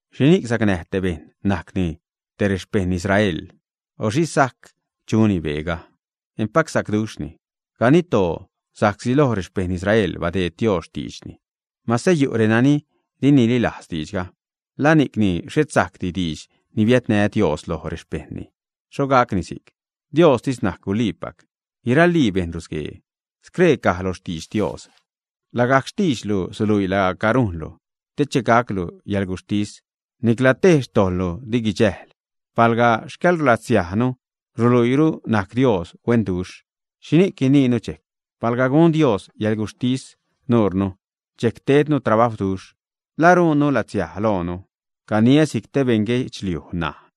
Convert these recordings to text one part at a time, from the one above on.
¿Xhini'c sacnäj te bejṉ najcni te rexpeṉ Israel, ä? O ¿xhi sajc chuni beega? ¡Empac sacduxhni! Ganidtoo, sa'csi loj rexpeṉ Israel badeed Dios xtiidxni. Mase yu' renani di nililajz diidxga, ¿la ni'cni xhet sajcdi diidx ni bia'n Dios loj rexpejṉni, ä? ¡Xho gacni si'c! Diostis najc guliipac, guiralii bejṉ rusguee. Scree caj lo xtidx Dios: Lagajc xtiidxlu suluii laaca rujnlu, te che gaclu yäḻguxhtis, nicla tej xtojḻlu di guidxäjl. Palga xcäḻlatsiajnu ruluiiru najc Dios huenduxh, ¿xhini'c guiniinu dxejc? Palga gun Dios yäḻguxhtis nurnu, dxejc tednu trabajwduxh, ¿la rujnni latsiaj loonu, ä? (Caniä si'c te beṉ guedxliuj ṉaj.)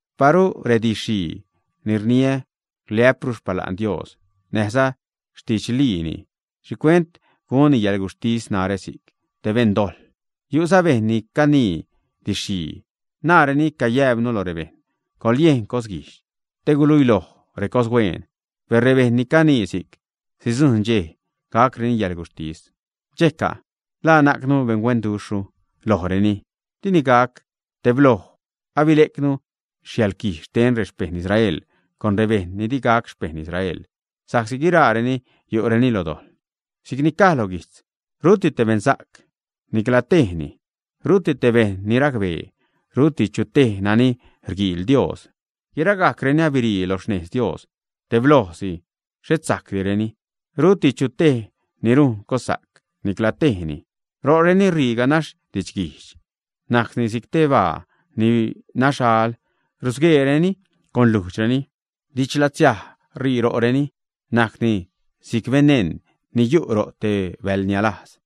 Paru redidx-xhii ni rniä riliä'pru xpala'n Dios näjza xtidxliini, ¿xhicuent gunni yäḻguxhtis narä si'c te beṉdojḻ? Yu'za bejṉ ni canii didx-xhii, najreni cayäjpnu lo rebejṉ: “Coḻyejn cosguijdx te guiluilojni recoshuen.” Per rebejṉ ni canii si'c sidzujṉ dxej gacreni yäḻguxhtis. ¿Dxejca'? ¿La najcnu beṉhuenduxhru lojreni, ä? Dini gac; tebloj abile'cnu yäḻquij xten rexpeṉ Israel con rebejṉ ni di gac xpeṉ Israel, sa'csi guiraareni yu'reni lo dojḻ. Si'cni caj lo guijtz: Ruti te beṉsa'c, nicla tejni. Ruti te bejṉ ni racbee, ruti chu tej nani rguiil Dios. Guiragajcreni abirii lo xnejz Dios, teblojsi xhet sajcdireni. Ruti chu tej ni rujn cossa'c, nicla tejni. Ro'reni ṟii ganax didxguijdx, najcni si'c te baa ni naxal, rusgueereni con lujdxreni, didxlatsiaj ṟii ro'reni najcni si'c beneṉ ni yu' ro' te bäḻnialajz.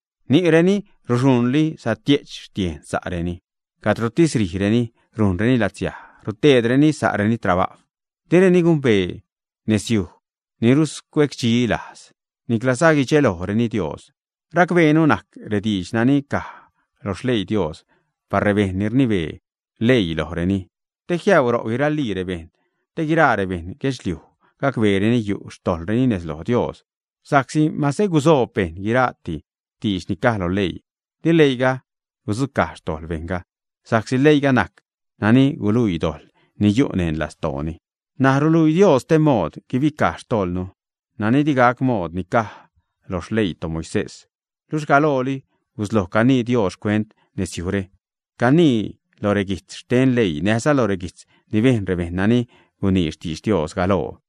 Ni'reni ruxuṉli saxhe' xtiejn sa'reni. Cadrotis rijreni rujnreni latsiaj, ruteedreni sa'reni trabajw. Direni gumbee nezyuj ni ruscuecdxilajz. Niclaza guidxelojreni Dios. Racbeenu najc rediidx nani caj lo xleii Dios par rebejṉ ni rnibee leii lojreni, te jiäuu ro' guiralii rebejṉ, te guiraa rebeṉ guedxliuj gacbeereni yu' xtojḻreni nez loj Dios. Sa'csi mase gusoob bejṉ guira'ti diidx ni caj lo leii, di leiiga gudzucaj xtojḻ bejṉga, sa'csi leiiga najc nani guluii dojḻ ni yu' neṉ lastooni. N̲aj ruluii Dios stee mood guibicaj xtojḻnu, nani di gac mood ni caj lo xleii toMoisés. Luxh galooli gusloj canii Dios xcuent nezyujre, cajni lo reguijtz xten leii näjza lo reguijtz ni bejn rebejṉ nani gunii xtidx Dios galoo.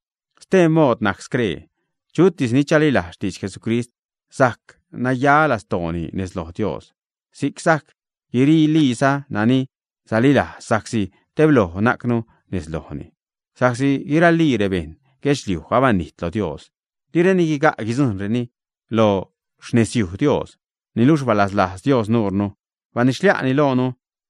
Stee mood najc scree: Chutis ni chalilajz xtidx Jesucrist, sajc naya lastooni nez loj Dios; si'c sajc garaliiza nani salilajz, sa'csi tebloj najcnu nez lojni. Sa'csi guiralii rebejṉ guedxliuj abanijt lo Dios, direni guiga' guidzujṉreni lo xnezyuj Dios. Niluxh balaslajz Dios nuunu, banidxxlia'ni loonu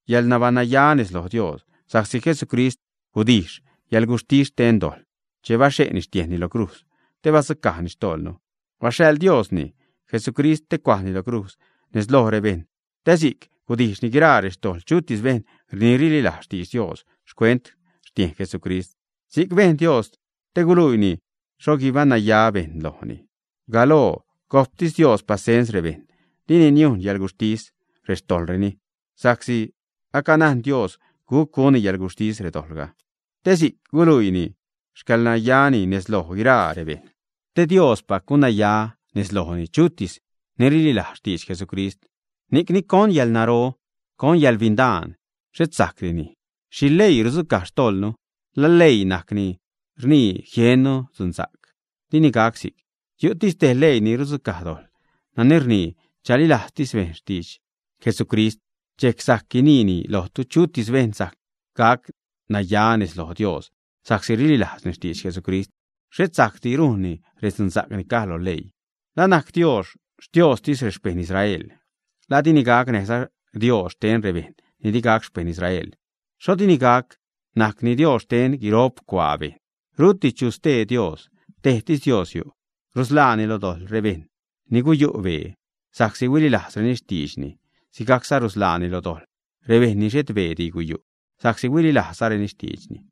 yäḻnabaṉnaya nez loj Dios sa'csi Jesucristis gudijx yäḻguxhtis xten dojḻ che baxhe'ni xtiejnni lo crujz te badzucajni xtojḻnu. Baxhaḻ Dios xi'nni, Jesucrist, te cuajni lo crujz nez loj rebejṉ te si'c gudijxni guiraa rextojḻ chutis bejṉ ni rililajz xtidx Dios xcuent xtiejn Jesucrist. Si'c bejn Dios te guluiini xho guibaṉnaya bejṉ lojni. Galoo gojptis Dios pasens rebejṉ, dini niujn yäḻguxhtis rextojḻreni, sa'csi acanajn Dios guc gunni yäḻguxhtis redojḻga, te si'c guiluiini xcäḻnayani nez loj guiraa rebejṉ, te Diospac gunnaya nez lojni chutis ni rililajz xtidx Jesucrist. Ni'cni ¿con yäḻnaro? ¿Con yäḻbindaan? ¡Xhet sajcdini! ¿Xhi leii rudzucaj xtojḻnu? ¿La leii najc ni rnii jiennu dzunsa'c, ä? ¡Dini gac si'c! Yu' tejtis leii ni rudzucaj dojḻ, nani rnii chalilajztis bejṉ xtidx Jesucrist. Dxejc sajc guiniä lojtu chutis bejṉ sajc gac naya nez loj Dios sa'csi rililajzni xtidx Jesucrist, xhet sa'csi rujnni redzunsa'c ni caj lo leii. ¿La najc Dios Xtiooztis rexpeṉ Israel, ä? ¿La dini gac näjza Dios xten rebejṉ ni di gac xpeṉ Israel? ¡Xho dini gac! Najcni Dios xten guirop cuaa bejṉ. Ruti chu stee Dios, tejtis Dios yu'. Rusḻaani lo dojḻ rebejṉ ni guyu' bee sa'csi huililajzreni xtiidxni, sigajcza rusḻaani lo dojḻ rebejṉ ni xhet beedi guyu' sa'csi huililajzzareni xtiidxni.